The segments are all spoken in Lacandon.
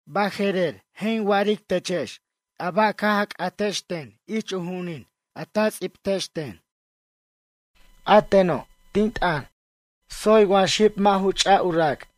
Baje'rer, je' in wa'aric techex a ba' caj a c'atex ten ich u ju'unin a ta ts'ibtex ten. A teno', tin t'ʌn, tsoy wa xib mʌ' ju ch'a u rac'.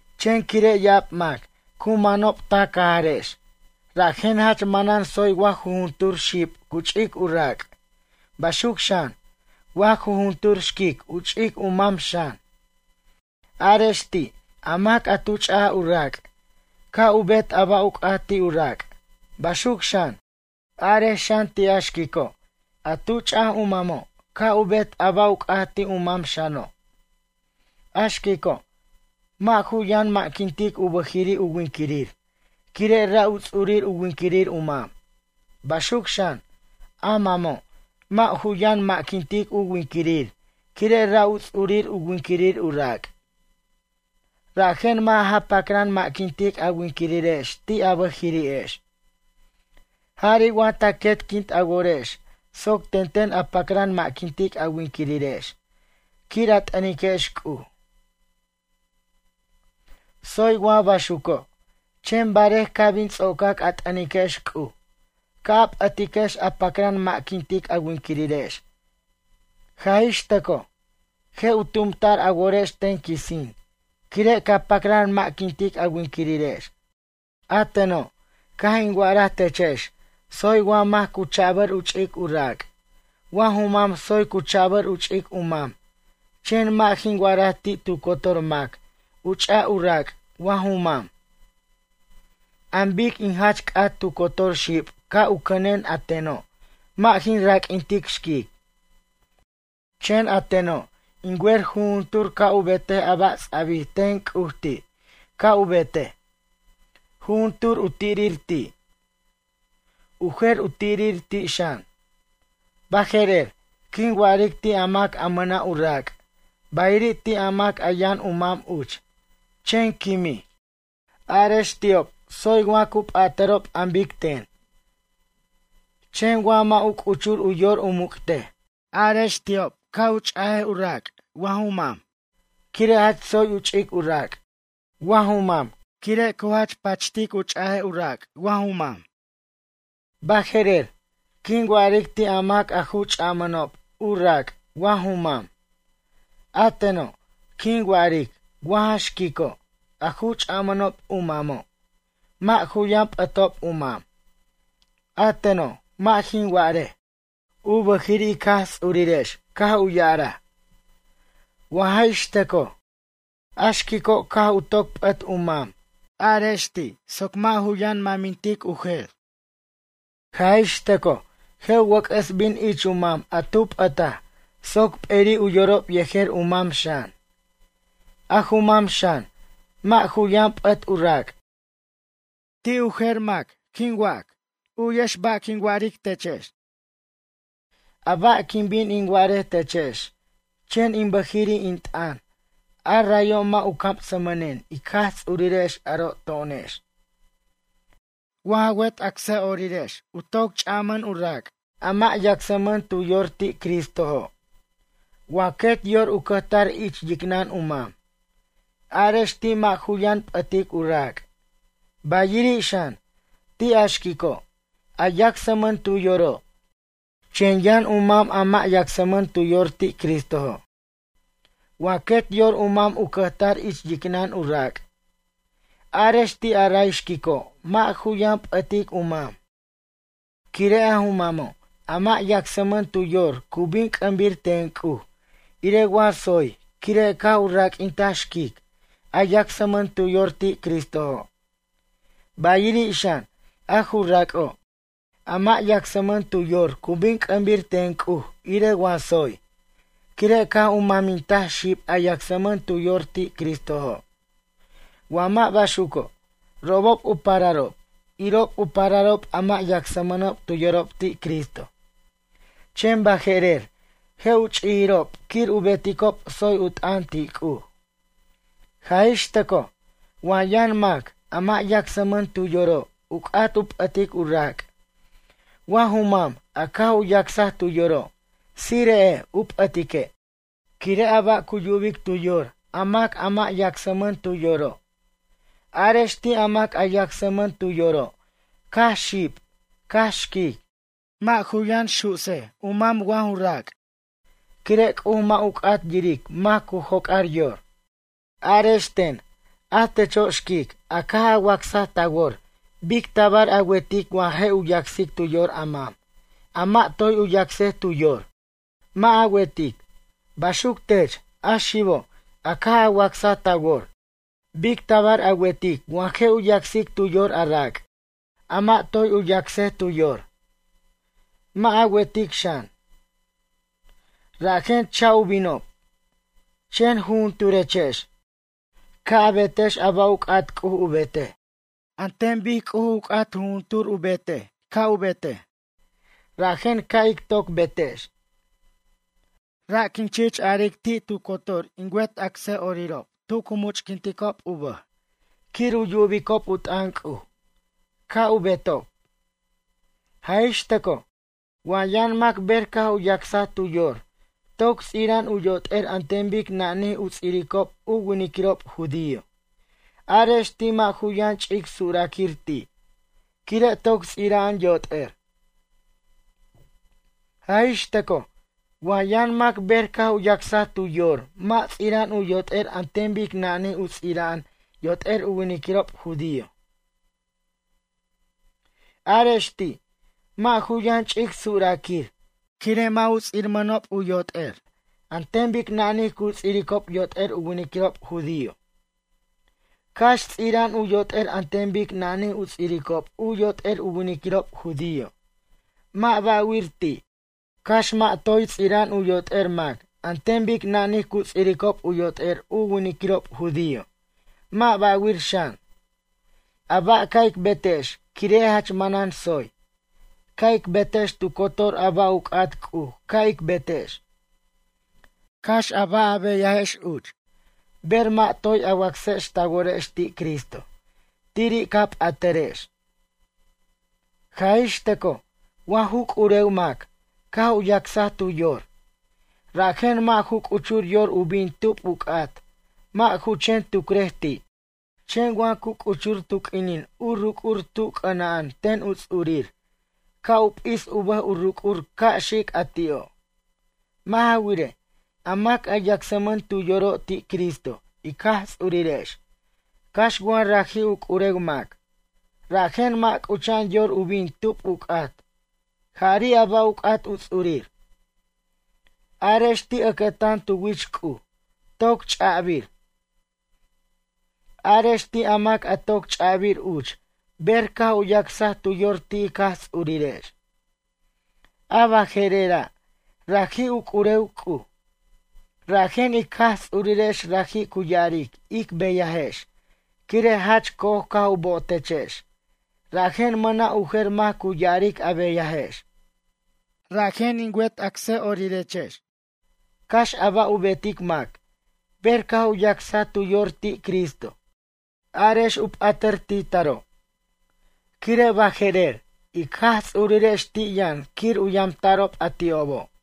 Chen quire' ya'ab mac cu manob ta cajarex, rajen jach manan tsoy wa jujuntur xib cu ch'ic u rac', baxuc xan, wa jujuntur xquic u ch'ic u mam xan. Arex ti', a mac a tu ch'aj u rac', ca' u bet a ba' u c'at ti' u rac', baxuc xan, arex xan ti' a xquico', a tu ch'aj u mamo' ca' u bet a ba' u c'at ti' u mam xano'. A xquico', mʌ' ju yʌn ma'quintic u bʌjiri' u winquirir, quire' ra' u ts'urir u winquirir u mam. Baxuc xan, a mamo', mʌ' ju yan ma'quintic u winquirir quire' ra' u ts'urir u winquirir u rac'. Rajen mʌ' ja pacran ma'quintic a winquirirex ti' a bʌjiri'ex. Jari' wa ta quetquint a worex soc tenten a pacran ma'quintic a winquirirex quir a t'ʌniquex C'uj. Tsoy wa baxuco', chen barej ca' bin ts'ocac a t'ʌniquex C'uj, Ca' a p'ʌtiquex a pacran ma'quint a winquirirex. Jaj ix tʌcoj, je' u tumta'r a worex ten quisin quire' ca pacran ma'quint a winquirirex. A teno', caj in wa'araj techex tsoy wa mac cu chabʌr u ch'ic u rac', wa ju mam tsoy cu chabʌr u ch'ic u mam chen mʌ' jin wa'araj ti' tu cotor mac u ch'a u rac' wa ju mam. An bic in jach c'at tu cotor xib ca' u cʌnen a teno', mʌ' jin raq'uintic xquic. Chen a teno', in wer jujuntur ca' u betej a ba' ts'abij ten C'uj ti', ca' u betej. Jujuntur u tirir ti'. U jer u tirir ti' xan. Baje'rer, quin wa'aric ti' a mac a mʌna' u rac', bayiri' ti' a mac a yʌn u mam uch, chen quimij. Arex ti'ob tsoy wa cu p'atʌrob an bic ten. Chen wa mʌ' u c'uchur u yor u muc'tej, arex ti'ob ca' u ch'a u rac' wa ju mam. Quire' jach tsoy u ch'ic u rac', wa ju mam quire' cu jach pachtej u ch'a u rac' wa ju mam. Baje'rer, quin wa'aric ti' a mac a ju ch'ajmʌnob u rac' wa ju mam. A teno', quin wa'aric wa ja xquico' a ju ch'amʌnob u mamo'. Mʌ' ju yʌn p'ʌtob u mam. A teno', mʌ' jin wa'arej, u bʌjiri' ic Jaj Ts'urirex caj u ya'araj. Wa jaj ix tʌcoj, a xquico' caj u toc p'ʌt u mam, arex ti' soc mʌ' ju yʌn mʌmintic u jer. Jaj ix tʌcoj je' u wʌc'ʌs bin ich u mam a tu p'ʌtaj soc p'eri' u yorob yejer u mam xan. A ju mam xan, mʌ' ju yʌn p'ʌt u rac'. Ti' a mac a t'irij, u'yex ba' quin wa'aric techex. A ba' quin bin in wa'arej techex chen in bʌjiri' in t'ʌn, a rayo' mʌ' u camsmʌnen ic Jaj Ts'urirex aro' to'onex. Wa ja wet acsa'orirex u toc ch'amʌn u rac', a mʌ' yacsmʌn tu yor ti' Cristojo'. Wa quet yor u cʌjtar ich yicnʌn u mam. Arex ti' mʌ' ju yʌn p'ʌtic u rac'. Bayiri' xan, ti' a xquico', a yacsmʌn tu yoro', chen yʌn u mam a mʌ' yacsmʌn tu yor ti' Cristojo'. Wa quet yor u mam u cʌjtar ich yicnʌn u rac'. Arex ti' a ray xquico' mʌ' ju yʌn p'ʌtic u mam. Quire' a ju mamo', a mʌ' yacsmʌn tu yor cu bin c'ʌmbir ten C'uj irej wa tsoy quire' caj u raq'uintaj xquic a yacsmʌn tu yor ti' Cristojo'. Bayiri' xan, a ju rac'o', a mʌ' yacsmʌn tu yor cu bin c'ʌmbir ten C'uj irej wa tsoy, quire' caj u mamintaj xib a yacsmʌn tu yor ti' Cristojo'. Wa mʌ' baxuco', robob u pararob, irob u pararob a mʌ' yacsmʌnob tu yorob ti' Cristo. Chen baje'rer, je' u ch'ijirob quir u beticob tsoy u t'ʌn ti' C'uj. Jaj ix tʌcoj wa yʌn mac, a mʌ' yacsmʌn tu yoro' u c'at u p'ʌtic u rac', wa ju mam a caj u yacsaj tu yoro', tsire'ej u p'ʌtique'. Quire' a ba' cu yubic tu yor a mac a mʌ' yacsmʌn tu yoro'. Arex ti' a mac a yacsmʌn tu yoro', cax xib, cax xquic, mʌ' ju yʌn su'sej u mam wa ju rac', quire' C'uj mʌ' ju c'at yiric mac cu joc'ar yor. Arex ten, a techo' xquic, a caj a wacsaj ta wor bic tabar a wertic wa je' u yacsic tu yor a mam, a mʌ' toy u yacsaj tu yor? Mʌ' a wertic. Baxuc tech, a xibo' a caj a wacsaj ta wor. Bic tabar a wertic wa je' u yacsic tu yor a rac', a mʌ' toy u yacsaj tu yor? Mʌ' a wertic xan. Rajen cha' u binob. Chen jujunturechex, ca' a betex a ba' u c'at C'uj u betej. An ten bic C'uj u c'at jujuntur u betej ca' u betej, rajen ca' ic toc betex. Ra' quin chich aric ti' tu cotor in wet acsa'orirob tu cu much'quinticob u bʌj quir u yubicob u t'ʌn C'uj, ca' u betob. Jaj ix tʌcoj, wa yʌn mac ber caj u yacsaj tu yor toc ts'ira'an u yot'er an ten bic nanij u ts'iricob u winiquirob judío, arex ti' mʌ' ju yʌn ch'ic suraquir ti', quire' toc ts'ira'an yot'er. Jaj ix tʌcoj wa yʌn mac ber caj u yacsaj tu yor mʌ' ts'ira'an yot'er an ten bic nanij u ts'ira'an yot'er u winiquirob judío, arex ti', mʌ' ju yʌn ch'ic suraquir quire' mʌ' u ts'irmʌnob u yot'er an ten bic nanij cu ts'iricob yot'er u winiquirob judío. Cax ts'ira'an u yot'er an ten bic nanij u ts'iricob u yot'er u winiquirob judío, mʌ' ba'wir ti'. Cax mʌ' toy ts'ira'an u yot'er mac an ten bic nanij cu ts'iricob u yot'er u winiquirob judío, mʌ' ba'wir xan. A ba' ca' ic betex quire' jach manan tsoy, ca' ic betex tu cotor a ba' u c'at C'uj ca' ic betex. Cax a ba' a beyajex uch, ber mʌ' toy a wacsex ta worex ti' Cristo, tiri' ca p'atʌrex. Jaj ix tʌcoj wa ju c'urew mac caj u yacsaj tu yor, rajen mʌ' ju c'uchur yor u bin tub u c'at, mʌ' ju chen tucrej ti'. Chen wa cu c'uchur tu q'uinin u ruc'ur tu c'ʌna'an ten u ts'urir, ca' u p'is u bʌj u ruc'ur ca' xic a ti'o'. Mʌ' ja wirej, a mac a yacsmʌn tu yoro' ti' Cristo ic Jaj Ts'urirex, cax wa raji' u c'urew mac, rajen mʌ' c'ucha'an yor u bin tub u c'at, jari' a ba' u c'at u ts'urir. Arex ti' ʌcʌtan tu wich C'uj, toc ch'abir. Arex ti' a mac a toc ch'abir uch ber caj u yacsaj tu yor ti' ic Jaj Ts'urirex. A baje'rera', raji' u c'urew C'uj. Rajen, ic Jaj Ts'urirex raji' cu ya'aric ic beyajex, quire' jach co'oj caj u bo'otechex, rajen mʌna' u jer mac cu ya'aric a beyajex. Rajen in wet acsa'orirex, cax a ba' u betic mac, ber caj u yacsaj tu yor ti' Cristo, arex u p'atʌr ti' taro'. Quire' baje'rer, ic Jaj Ts'urirex ti' yʌn quir u yamta'rob a ti'obo'.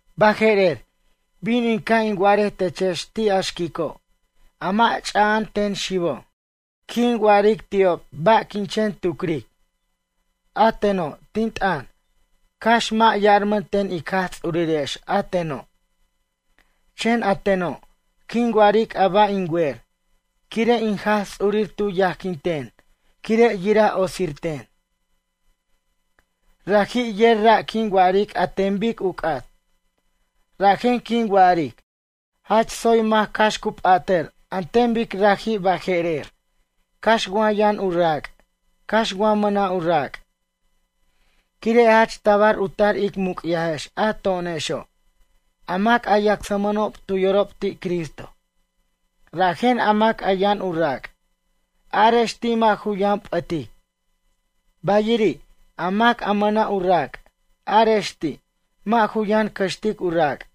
Baje'rer, bin in ca' in wa'arej techex ti' a xquico', a mʌ' ch'aja'an ten xibo'. Quin wa'aric ti'ob ba' quin chen tucric. A teno', tin t'ʌn, cax mʌ' yarman ten ic Jaj Ts'urirex a teno'. Chen a teno', quin wa'aric a ba' in wer, quire' in Jaj Ts'urir tu yajquinten quire' yira otsirten. Raji' yer ra' quin wa'aric an ten bic u c'at. Rajen, quin wa'aric, jach tsoy mac cax cu p'atʌr an ten bic raji' baje'rer, cax wa yʌn u rac', cax wa mʌna' u rac'. Quire' jach tabar u tar ic muc'yajex a to'onexo', a mac a yacsmʌnob tu yorob ti' Cristo. Rajen a mac a yʌn u rac', arex ti' mʌ' ju yʌn p'ʌtic. Bayiri', a mac a mʌna' u rac', arex ti', mʌ' ju yʌn cʌxtic a rac'.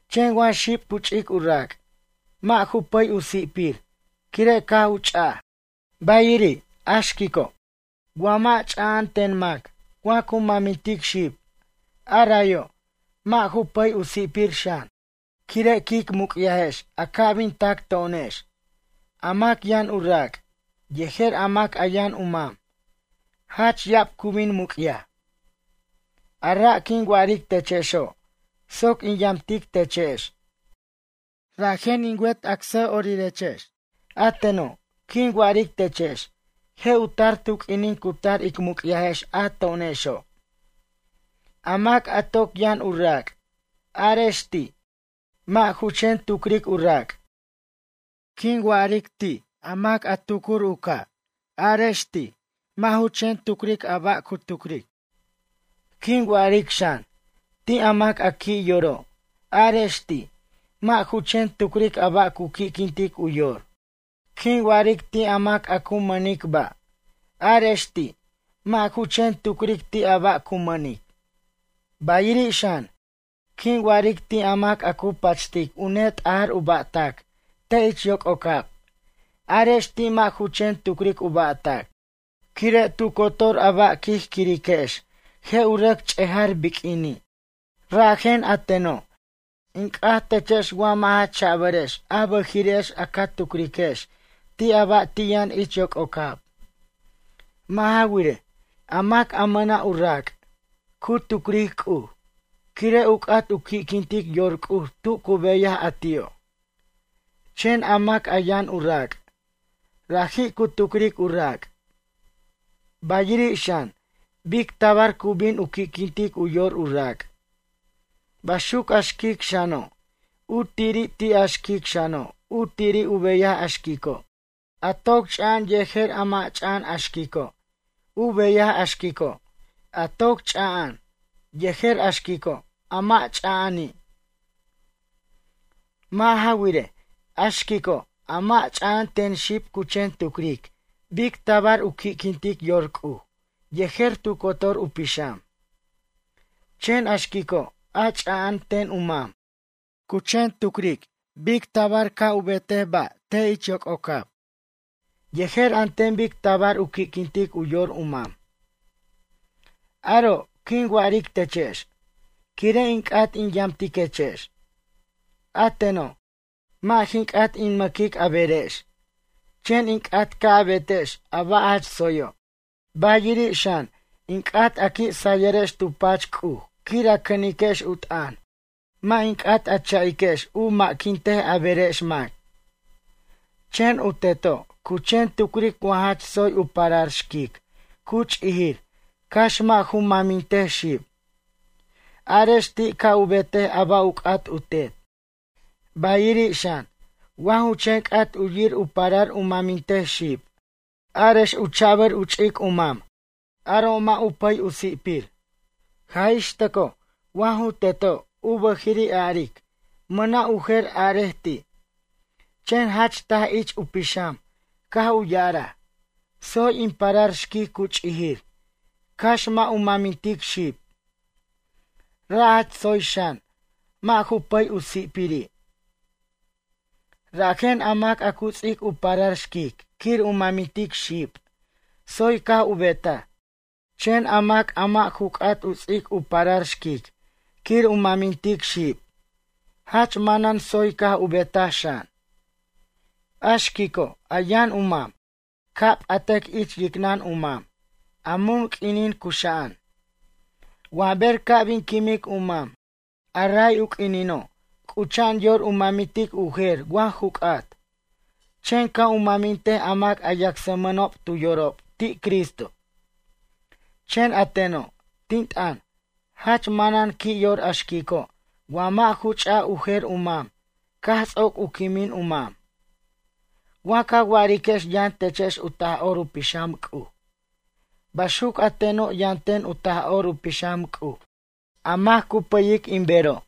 Chen wa xib cu ch'ic u rac', mʌ' ju pʌy u si'pir quire' caj u ch'aj. Bayiri', a xquico', wa mʌ' ch'ama'an ten mac wa cu mamintic xib, a rayo', mʌ' ju pʌy u si'pir xan. Quire' quic muc'yajex a ca' bin tac to'onex, a mac yʌn u rac', yejer a mac a yʌn u mam, jach ya'ab cu bin muc'yaj. A ra' quin wa'aric techexo', soc in yamtic techex. Rajen, in wet acsa'orirex, a teno', quin wa'aric techex je' u tar tu q'uinin cu tar ic muc'yajex a to'onexo'. A mac a toc yʌn u rac', arex ti', mʌ' ju chen tucric u rac'. Quin wa'aric ti' a mac a tucur u ca', arex ti', mʌ' ju chen tucric a ba' cu tucric. Quin wa'aric xan, ti' mac a qui' yoro', arex ti', mʌ' ju chen tucric a ba' cu qui'quintic u yor. Quin wa'aric ti' a mac a cu mʌnic ba', arex ti', mʌ' ju chen tucric ti' a ba' cu mʌnic. Bayiri' xan, quin wa'aric ti' a mac a cu pachtic u ne t'ajʌr u ba'tac te' ich yococab, arex ti' mʌ' ju chen tucric u ba'tac. Quire' tu cotor a ba' quij quiriquex je' u rʌc ch'ejar biq'uini'. Rajen, a teno', in c'at techex wa mʌ' ja cha'bʌrex a bʌjiri'ex a ca tucriquex ti' a ba' ti' yʌn ich yococab. Mʌ' ja wirej, a mac a mʌna' u rac', cu tucric C'uj, quire' u c'at u qui'quintic yor C'uj tu cu beyaj a ti'o'. Chen a mac a yʌn u rac', raji' cu tucric u rac'. Bayiri' xan, bic tabar cu bin u qui'quintic u yor u rac'. Baxuc a xquic xano', u tiri' ti' a xquic xano' u tiri' u beyaj a xquico', a toc cha'an yejer a mʌ' cha'an a xquico' u beyaj a xquico', a toc ch'a'an, yejer a xquico' a mʌ' ch'aja'ani'. Mʌ' ja wirej, a xquico' a mʌ' ch'a'an ten xib cu chen tucric bic tabar u qui'quintic yor C'uj yejer tu cotor u pixam. Chen a xquico' a ch'a'an ten u mam, cu chen tucric bic tabar a ba' ca' u betej ba' te' ich yococab, yejer an ten bic tabar u qui'quintic u yor u mam. Aro' quin wa'aric techex, quire' in c'at in yamtiquechex. A teno', mʌ' jin c'at in ma'quic a berex. Chen in c'at ca' a betex a ba' jach tsoyo'. Bayiri' xan, in c'at a qui' sayʌrex tu pach C'uj quir a cʌniquex u t'ʌn, mʌ' in c'at a cha'iquex u ma'quintej a berex mac. Chen u teto', cu chen tucric wa jach tsoy u parar xquic cu ch'ijir cax mʌ' ju mamintej xib, arex ti' ca' u betej a ba' u c'at u tet. Bayiri' xan, wa ju chen c'at u yir u parar u mʌmintej xib, arex u cha'bʌr u ch'ic u mam, aro' mʌ' u pʌy u si'pir. Jaj ix tʌcoj wa ju teto', u bʌjiri' aric, mʌna' u jer arej ti', chen jach taj ich u pixam caj u ya'araj: “Tsoy in parar xquic cu ch'ijir, cax mʌ' u mamintic xib.” Ra' jach tsoy xan, mʌ' ju pʌy u si'piri'. Rajen a mac a cu ts'ic u parar xquic quir u mamintic xib, tsoy caj u betaj. Chen a mac a mʌ' ju c'at u ts'ic u parar xquic quir u mamintic xib, jach manan tsoy caj u betaj xan. A xquico', a yʌn u mam, ca' u p'atʌc ich yicnʌn u mam, a mun q'uinin cuxa'an. Wa ber ca' bin quimic u mam, a ray u q'uinino', c'ucha'an yor u mamintic u jer wa ju c'at. Chen ca' u mʌmintej a mac a yacsmʌnob tu yorob ti' Cristo. Chen a teno', tin t'ʌn, jach manan qui' yor a xquico', wa mʌ' ju ch'a u jer u mam caj ts'oc u quimin u mam. Wa ca wa'ariquex yʌn techex u Taj'or u Pixam C'uj. Baxuc a teno' yʌn ten u Taj'or u Pixam C'uj a mac cu pʌyic in bero'.